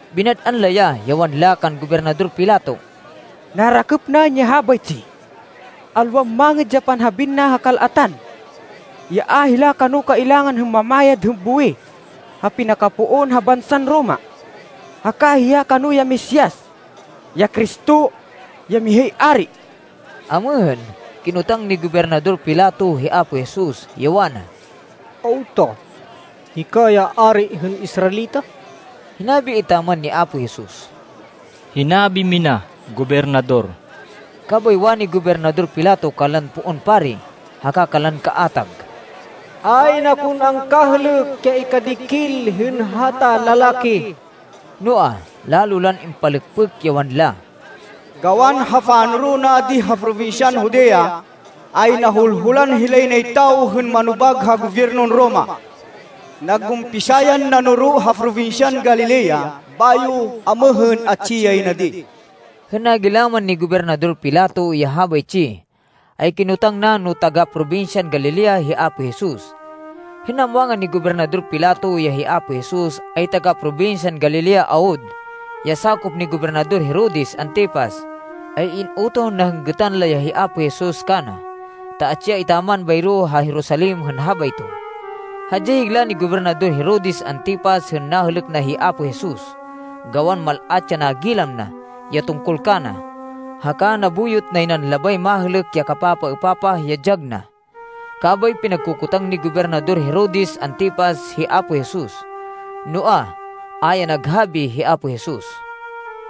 Binad-an la ya, ya wanla kan Gobernador Pilato, “Narakêp naên ya habaytsi. Alwan mangêd ya panhabiên na ha kal-atan, ya a hila kano kailangan hên mamayad hên buwih ha pinakapoon ha bansan Roma, haka hiya kano ya Mesias, ya Cristo, ya mihay ari.” Amêhên, kinotang ni Gobernador Pilato hi Apo Jesus, ya wana, “Awta? Hika ya ari hên Israelita?” Hinabi etaman ni Apo Jesus, “Hinabi mina, Gobernador.” Kabay wani Gobernador Pilato kanlan poon pari haka kanlan kaatag, “Ayn akon angkahêlêk ya ikadikil hên hata lalaki.” Noa, lalo lan impalêkpêk, ya wanla, “Gawan ha panoro na di ha probinsyan Judea, ay nahulhulan hilay nay tawo hên manobag ha gobyernon Roma. Nag-umpisa yan nanoro ha probinsyan Galilea, bayo amêhên atsi yay na di.” Hên nagilaman ni Gobernador Pilato ya habaytsi, ay kinotang na no taga-probinsyan Galilea hi Apo Jesus. Hên namwangan ni Gobernador Pilato ya hi Apo Jesus ay taga-probinsyan Galilea awud, ya sakop ni Gobernador Herodes Antipas, ay in-utoh na hên gêtan la ya hi Apo Jesus kana, ta atsi ya etaman bayro ha Jerusalem hên habayto. Hadyay higla ni Gobernador Herodes Antipas hên nahêlêk na hi Apo Jesus, gawan mal-at ya nagilam na, ya tungkol kana, haka nabuyot nay nan labay mahêlêk ya kapapaêpapah ya dyag na. Kabay pinagkokotang ni Gobernador Herodes Antipas hi Apo Jesus. Noa, a ya naghabi hi Apo Jesus.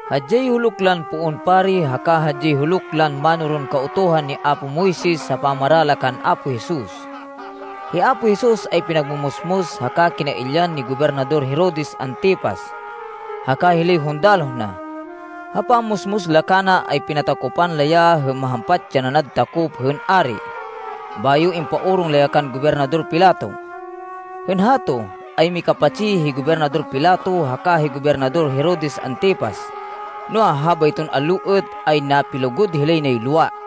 Hadyay huluk lan poon pari haka hadyay huluk lan mánoron Kautuhan ni apo Moises ha pamara la kan Apo Jesus. Hi Apo Jesus ay pinagmumusmus haka kinailyan ni Gobernador Herodes Antipas haka hilay hundaloh na. Ha pammusmus la kana ay pinatakopan la ya hên mahampat ya nanad takop hên ari, bayo impaorong la ya kan Gobernador Pilato. Hên hato, ay mikapatsi hi Gobernador Pilato haka hi Gobernador Herodes Antipas, noa, habayton allo êt ay napilugud hilay nay lowa.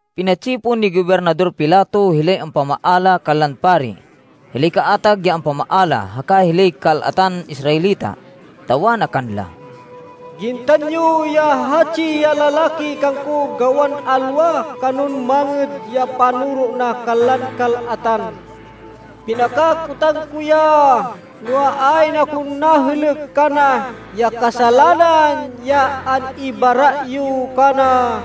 Pinatsipon ni Gobernador Pilato hilay ampamaala kanlan pari, hilay kaatag ya ampamaala, haka hilay kal-atan Israelita. Ta wana kanla, “Gintan yo ya hatsi ya lalaki kangko gawan alwa kanon mangêd ya panoro na kanlan kal-atan. Pinakakotang ko ya, noa, ayn akon nahêlêk kana ya kasalanan ya an-ibara yo kana.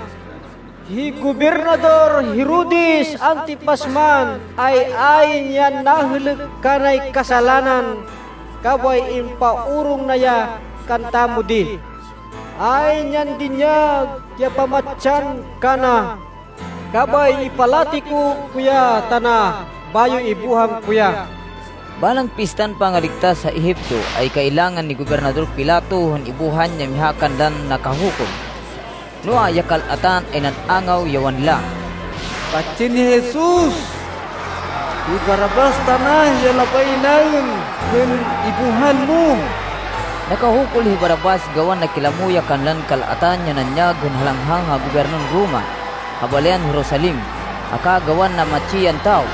Hi Gobernador Herodes Antipas man, ay ayn yan nahêlêk kanay kasalanan, kabay impaorong na ya kantamo di. Ayn yan dinyag ya pamatsan kana. Kabay ipalatiko ko ya tana, bayo ibuhan ko ya.” (Balang Pistan Pangaligtas ha Egipto, ay kailangan ni Gobernador Pilato hên ibuhan ya miha kanlan nakahukul.) Noa, ya kal-atan ay nan-angaw, ya wanla, “Patsên hi Jesus! Hi Barrabas tana ya labay naên hên ibuhan mo!” (Nakahukul hi Barrabas gawan nakilamo ya kanlan kal-atan ya nanyag hên halanghang ha gobyernon Roma ha balayan Jerusalem, haka gawan namatsi yan tawo.)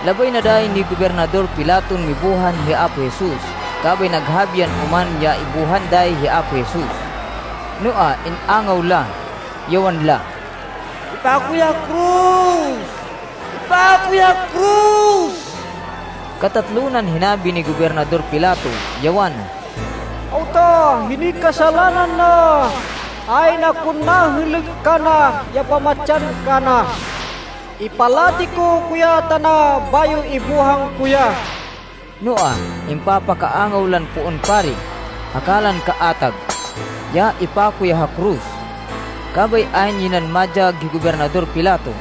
Labay na dayi ni Gobernador Pilaton mibuhan hi Apo Jesus, kabay naghabi yan oman ya ibuhan dayi hi Apo Jesus. Noa, in-angaw la, ya wanla, “Ipako ya ha koros! Ipako ya ha koros!” Katatlo nan hinabi ni Gobernador Pilato, ya wana, “Awta? Hinoy kasalanan na? Ayn akon nahêlêk kana ya pamatsan kana. Ipalatiko ko ya tana, bayo ibuhan ko ya.” Noa, impapakaangaw lan poon pari haka lan kaatag, ya ipako ya ha koros. Kabay ayn yay nan madyag hi Gobernador Pilato.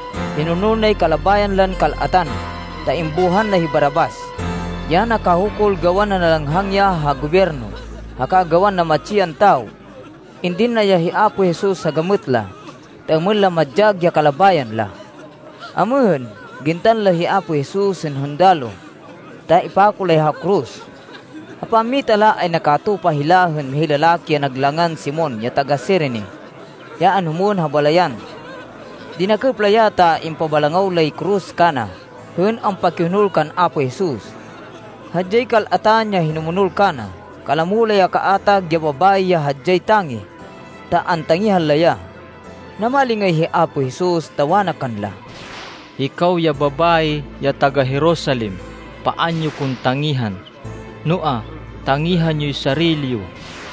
Hinonol nay kalabayan lan kal-atan, ta imbuhan na hi Barrabas, ya nakahukul gawan nanalanghang ya ha gobyerno, haka gawan namatsi yan tawo. Indin na ya hi Apo Jesus ha gamêt la, ta êmên la madyag ya kalabayan la. Amêhên, gintan la hi Apo Jesus hên hundaloh ta ipako la ya ha koros. Ha pammita la ay nakatupa hila hên mihay lalaki ya nag langan Simon ya taga-Cirene, ya anhumwên ha balayan. Dinakêp la ya ta impabalangaw lay koros kana hên ampakihonol kan Apo Jesus. Hadyay kal-atan ya hinumonol kana. Kalamo la ya kaatag ya babayi ya hadyay tangih, ta antangihan la ya. Namalingay hi Apo Jesus, ta wana kanla, “Hikaw ya babayi ya taga-Jerusalem, paan yo ko tangihan, noa, tangihan yoy sarili yo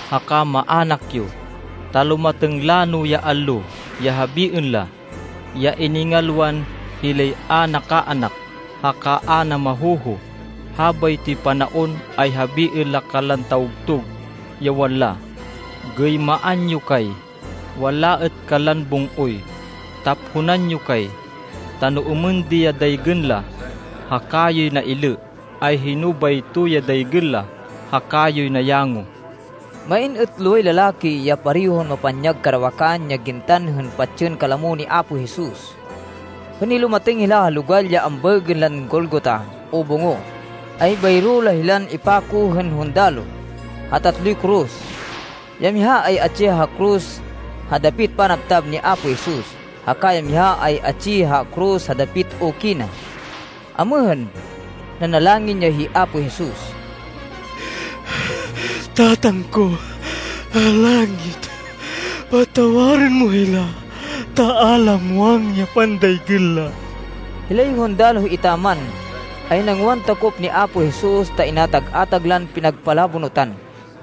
haka maának yo, ta lumatêng lano ya allo ya habiên la, ya iningalwan hilay a nakaanak haka a namahoho. Habaytoy panaon ay habiên la kanlan tawgtug, ya wanla, ‘Gêymaan yo kay.’ Wanla êt kanlan bung-oy, ‘Taphonan yo kay.’ Ta no êmên di ya daygên la ha kayoy nailê, ay hino bayto ya daygên la ha kayoy nayango?” Main êt loway lalaki, ya parehon mapanyag karawakan ya gintan hên patsên kalamo ni Apo Jesus. Hên nilumatêng hila ha logal ya ambaêgên lan Golgota o Bungo, ay bayro la hilan impako hên hundaloh, ha tatloy koros. Ya miha ay atsi ha koros ha dapit panabtab ni Apo Jesus, haka ya miha ay atsi ha koros ha dapit uki na. Amêhên, nanalangin ya hi Apo Jesus, “Tatang ko ha langit, patawarên mo hila ta a la muwang ya pandaygên la.” Hilay hundaloh etaman, ay nangwan takop ni Apo Jesus ta inatag-atag lan pinagpalabonutan.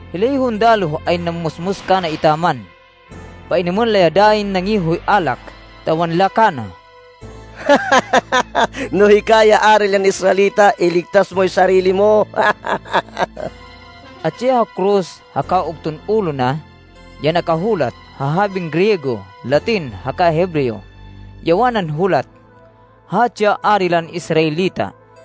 Hilay hundaloh ay nammusmus kana etaman. Painêmên la ya dayin nangihoy alak, ta wanla kana, “No hika ya Ari lan Israelita, iligtas moy sarili mo!” Atsi ha koros, ha ugton ulo na, ya nakahulat (ha habin Griego, Latin, haka Hebreo), ya wanan hulat, “Hatsi ya Ari lan Israelita.”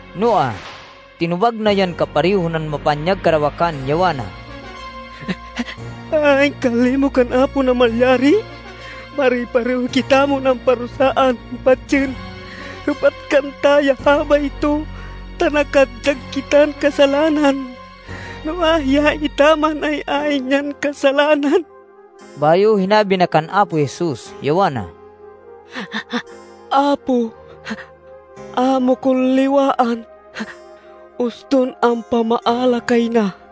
Noa, tinobag na yan kapareho nan mapanyag karawakan, ya wana, “Ayn kan limo kan Apo Namalyari? Pare-pareho kitamon amparusaan hên patsên. Hêpat kanta ya habayto ta nakadyag kitan kasalanan, noa, hiya etaman, ay ayn yan kasalanan.” Bayo hinabi na kan Apo Jesus, ya wana, “Apo, a mo kon liwaan, uston ampamaala kay na.”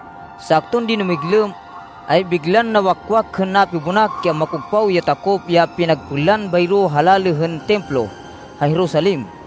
Sakton dinumiglêm, ay biglan nawakwak hên napibonak ya makogpaw ya takop ya pinagpênlan bayro ha lalê hên Templo ha Jerusalem.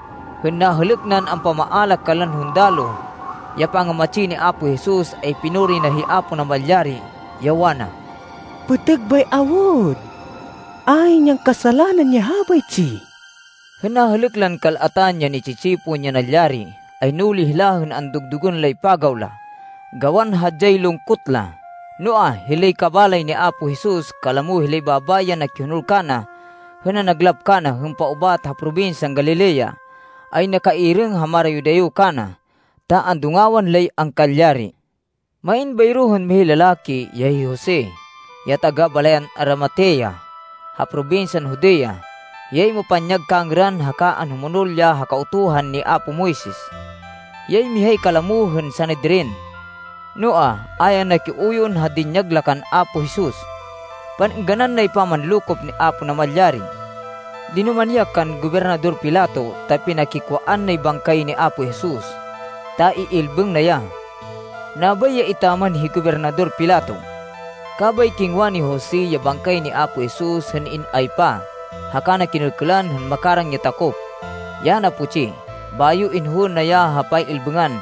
Hên nahêlêk nan ampamaala kanlan hundaloh, ya pangamatsi ni Apo Jesus, ay pinuri na hi Apo Namalyari, ya wana, “Pêtêg bay awud! Ayn yan kasalanan ya habaytsi!” Hên nahêlêk lan kal-atan ya ni-tsi-tsipon, ya nalyari, ay nuli hila hên andugdugên lay pagaw la, gawan hadyay lungkot la. Noa, hilay kabalay ni Apo Jesus, kalamo hilay babayi ya nakihonol kana hên nanaglap kana, hên paubat ha probinsyan Galilea, ay nakairêng ha marayo-dayo kana, ta andungawan lay angkalyari. Main bayro hên mihay lalaki, ya hi Jose, ya taga-balayan Arimatea ha probinsyan Judea. Hiyay mapanyag kangêran haka anhumonol ya ha Kautuhan ni apo Moises. Hiyay mihay kalamo hên Sanedrin. Noa, a ya nakiuyon ha dinyag la kan Apo Jesus. Pan-êngganan nay pamanlokop ni Apo Namalyari. Dinumani ya kan Gobernador Pilato, ta pinakikwaan nay bangkay ni Apo Jesus, ta iilbêng na ya. Nabay ya etaman hi Gobernador Pilato. Kabay kingwa ni Jose ya bangkay ni Apo Jesus, hên in-aypa, haka na kinêlkêlan hên makarang ya takop, ya naputsi. Bayo inhowên na ya ha pay-ilbêngan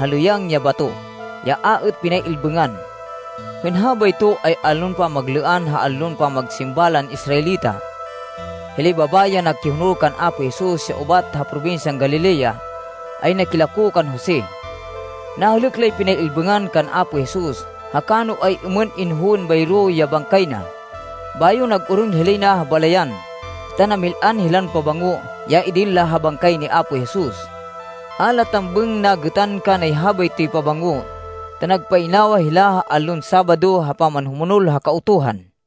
ha lêyang ya bato, ya a êt pinay-ilbêngan. Hên habayto ay allon pamaglêan ha allon pamagsimba lan Israelita. Hilay babayi ya nakihonol kan Apo Jesus ya ubat ha probinsyan Galilea, ay nakilako kan Jose. Nahêlêk lay pinay-ilbêngan kan Apo Jesus haka no ay-êmên inhowên bayro ya bangkay na. Bayo nag-orong hilay na ha balayan, ta namil-an hilan pabango, ya idin la ha bangkay ni Apo Jesus. A la tambêng nagêtan kanay habaytoy pabango, ta nagpainawa hila ha allon Sabado ha pamanhumonol ha Kautuhan.